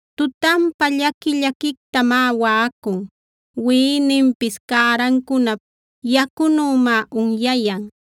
Tutanpa llaqui-llaquictamá waꞌacun; wiꞌininpis cärancunap yacunümá unyayan.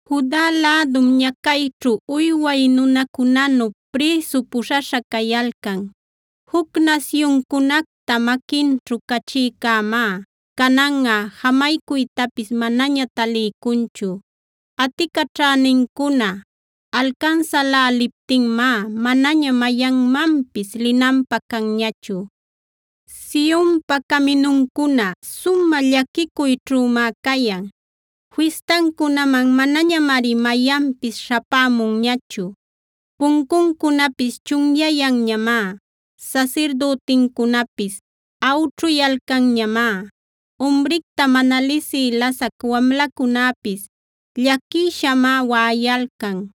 Juda lädum ñacayćhu uyway nunacunanu prïsu puśhaśha cayalcan. Juc nasyuncunacta maquinćhu cachïcämá cananꞌa jamaycuytapis manaña taliycunchu. Aticaćhänincuna alcansäläliptinmá, manaña mayanmanpis linanpä canñachu. Sionpa caminuncuna sumä llaquicuyćhümá cayan; fistancunaman manañamari mayanpis śhapämunñachu. Puncuncunapis chunyayanñamá; sasirdütincunapis awćhuyalcanmá. Umricta mana lisï lasac wamlacunäpis llaquishamá waꞌayalcan;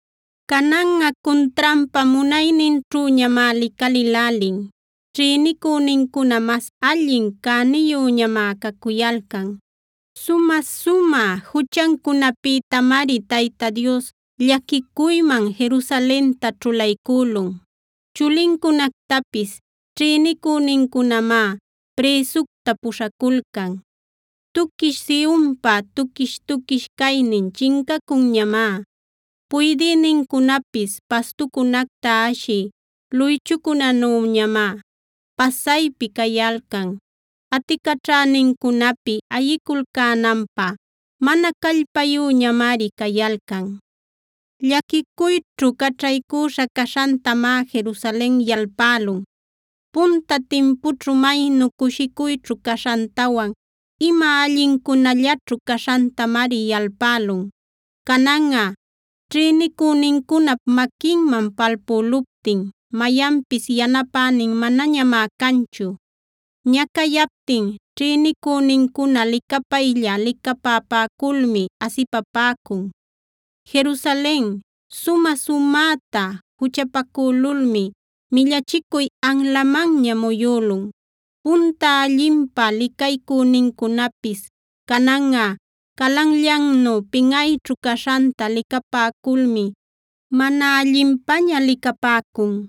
Cananꞌa cuntranpa munayninćhüñamá licalïlälin; ćhïnicünincuna mas allin cäniyüñamá cacuyalcan. Sumä-sumä juchancunapïtamari Tayta Dios llaquicuyman Jerusalenta ćhulaycülun. Chulincunactapis ćhïnicünincunamá prïsucta puśhaculcan. Tuquish Sionpa tuquish-tuquish caynin chincacunñamá; puydïnincunapis pastucunacta ashï luychucunanüñamá pasaypi cayalcan. Aticaćhänincunapi ayiculcänanpä mana callpayüñamari cayalcan. Llaquicuyćhu caćhaycüśha caśhantamá Jerusalen yalpälun; punta timpućhu maynu cushicuyćhu caśhantawan ima allincunallaćhu caśhantamari yalpälun. Cananꞌa ćhïnicünincunap maquinman palpüluptin mayanpis yanapänin manañamá canchu. Ñacayaptin ćhïnicünincuna licapaylla-licapapäculmi asipapäcun. Jerusalen sumä-sumäta juchapacülulmi millachicuy anlamanña muyülun. Punta allinpä licaycünincunapis cananꞌa calanllannu pinꞌayćhu caśhanta licapäculmi mana allinpaña licapäcun.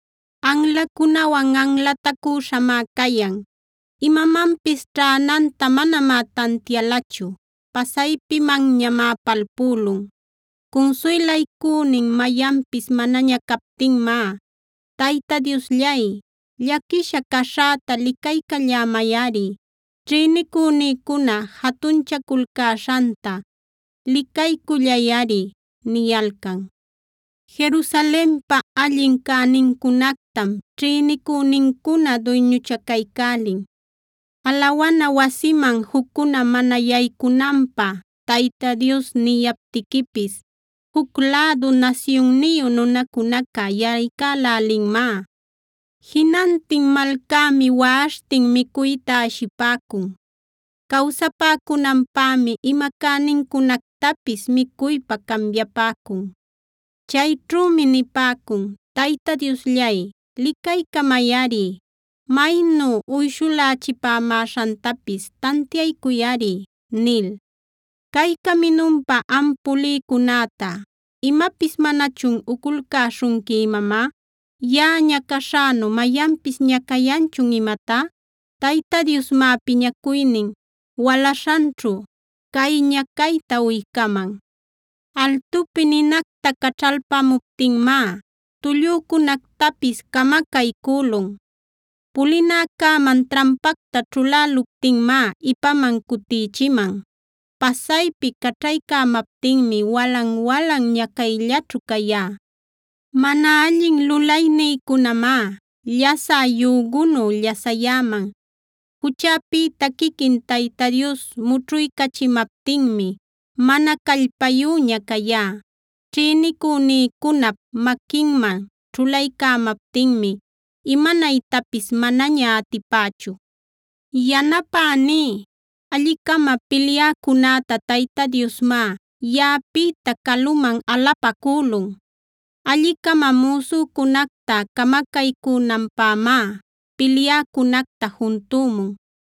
Anlacunawan anlatacüśhamá cayan; imamanpis ćhänanta manamá tantialachu. Pasaypimanñamá palpülun. Cunsuylaycünin mayanpis manaña captinmá: “Tayta Diosllay, llaquisha caśhäta licaycallämayꞌari. Ćhïnicünïcuna jatunchaculcäśhanta licaycullayꞌari” niyalcan. Jerusalenpa allin cänincunactam ćhïnicünincuna duyñuchacaycälin.f Alawana wasiman juccuna mana yaycunanpä Tayta Dios niyaptiquipis, juc lädu nasyunniyu nunacunaca yaycälälinmá. Jinantin malcämi waꞌaśhtin micuyta ashipäcun. Cawsapäcunanpämi ima cänincunactapis micuypä cambiapäcun. Chayćhümi nipäcun: “Tayta Diosllay, licaycamayꞌari; maynu uyshulächipämäśhantapis tantiaycuyꞌari” nil. Cay caminunpa am pulïcunäta, ¿imapis manachun uculcäśhunqui imamá? ¿Yaꞌa ñacaśhänu mayanpis ñacayanchun imatá? Tayta Diosmá piñacuynin walaśhanćhu cay ñacayta uycaman. Altupi ninacta caćhalpämuptinmá tullücunactapis camacaycülun; pulinäcäman trampacta ćhuläluptinmá ipaman cutïchiman. Pasaypi caćhaycämaptinmi walan-walan ñacayllaćhu cayá. Mana allin lulaynïcunamá llasä yügunu llasayäman; juchäpïta quiquin Tayta Dios mućhuycachimaptinmi mana callpayüña cayá. Ćhïnicünïcunap maquinman ćhulaycämaptinmi, imanaytapis manaña atipächu. Yanapämä alli-cama pilyäcunäta Tayta Diosmá yaꞌapïta caluman alapacülun. Alli-cama müsücunacta camacaycünanpämá pilyäcunacta juntümun.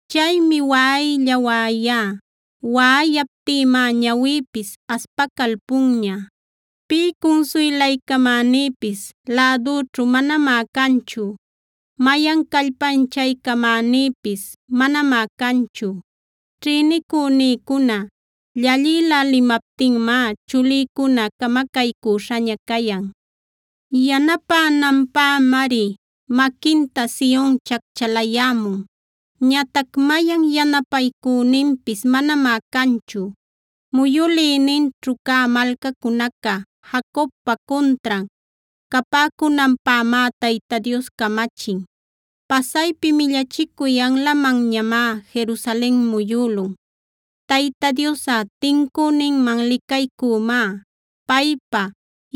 Chaymi waꞌaylla-waꞌayá; waꞌayaptïmá ñawïpis aspacalpunña; pï cunsuylaycamänïpis lädüćhu manamá canchu. Mayan callpanchaycamänïpis manamá canchu. Ćhïnicünïcuna llallïlälimaptinmá chulïcuna camacaycüśhaña cayan. Yanapänanpämari maquinta Sion chacchalayämun; ñatac mayan yanapaycüninpis manamá canchu. Muyülïninćhu cä malcacunaca Jacobpa cuntran capäcunanpämá Tayta Dios camachin. Pasaypi millachicuy anlamanñamá Jerusalen muyülun. Tayta Diosꞌa tincüninman licaycümá; paypa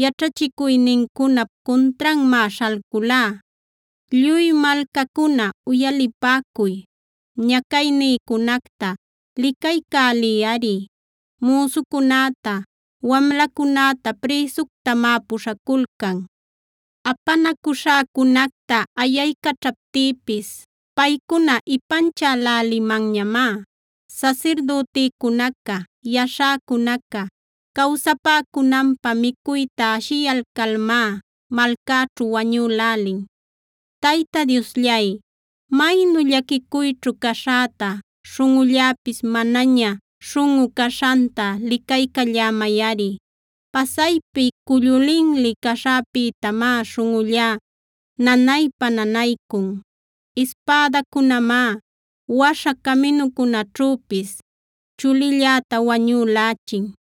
yaćhachicuynincunap cuntranmá śhalculá. Lluy malcacuna, uyalipäcuy; ñacaynïcunacta licaycäliyꞌari. Müsucunäta, wamlacunäta prïsuctamá puśhaculcan. Apanacuśhäcunacta ayaycaćhaptïpis, paycuna ipanchälälimanñamá. Sasirdütïcunaca, yaśhäcunaca cawsapäcunanpä micuyta ashiyalcalmá malcäćhu wañülälin. Tayta Diosllay, maynu llaquicuyćhu caśhäta, śhunꞌulläpis manaña śhunꞌu caśhanta licaycallämayꞌari. Pasaypi cullu linli caśhäpïtamá śhunꞌullá nanaypa-nanaycun. Ispädacunämá waśha caminucunäćhüpis chulilläta wañülächin.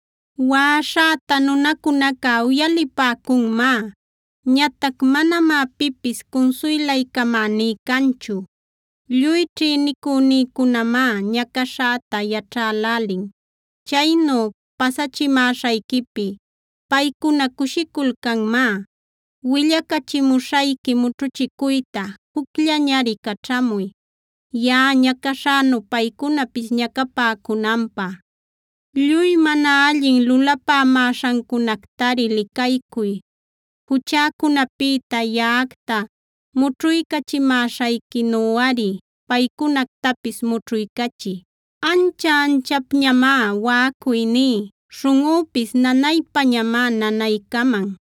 Waꞌaśhäta nunacunaca uyalipäcunmá; ñatac manamá pipis cunsuylaycamäní canchu. Lluy ćhïnicünïcunamá ñacaśhäta yaćhälälin; chaynu pasachimäśhayquipi paycuna cushiculcanmá. Willacachimuśhayqui mućhuchicuyta jucllañari caćhamuy, yaꞌa ñacaśhänu paycunapis ñacapäcunanpä. Lluy mana allin lulapämäśhancunactari licaycuy. Juchäcunapïta yaꞌacta mućhuycachimäśhayquinuꞌari paycunactapis mućhuycachiy. Ancha-anchapañamá waꞌacuyní; śhunꞌüpis nanaypañamá-nanaycaman.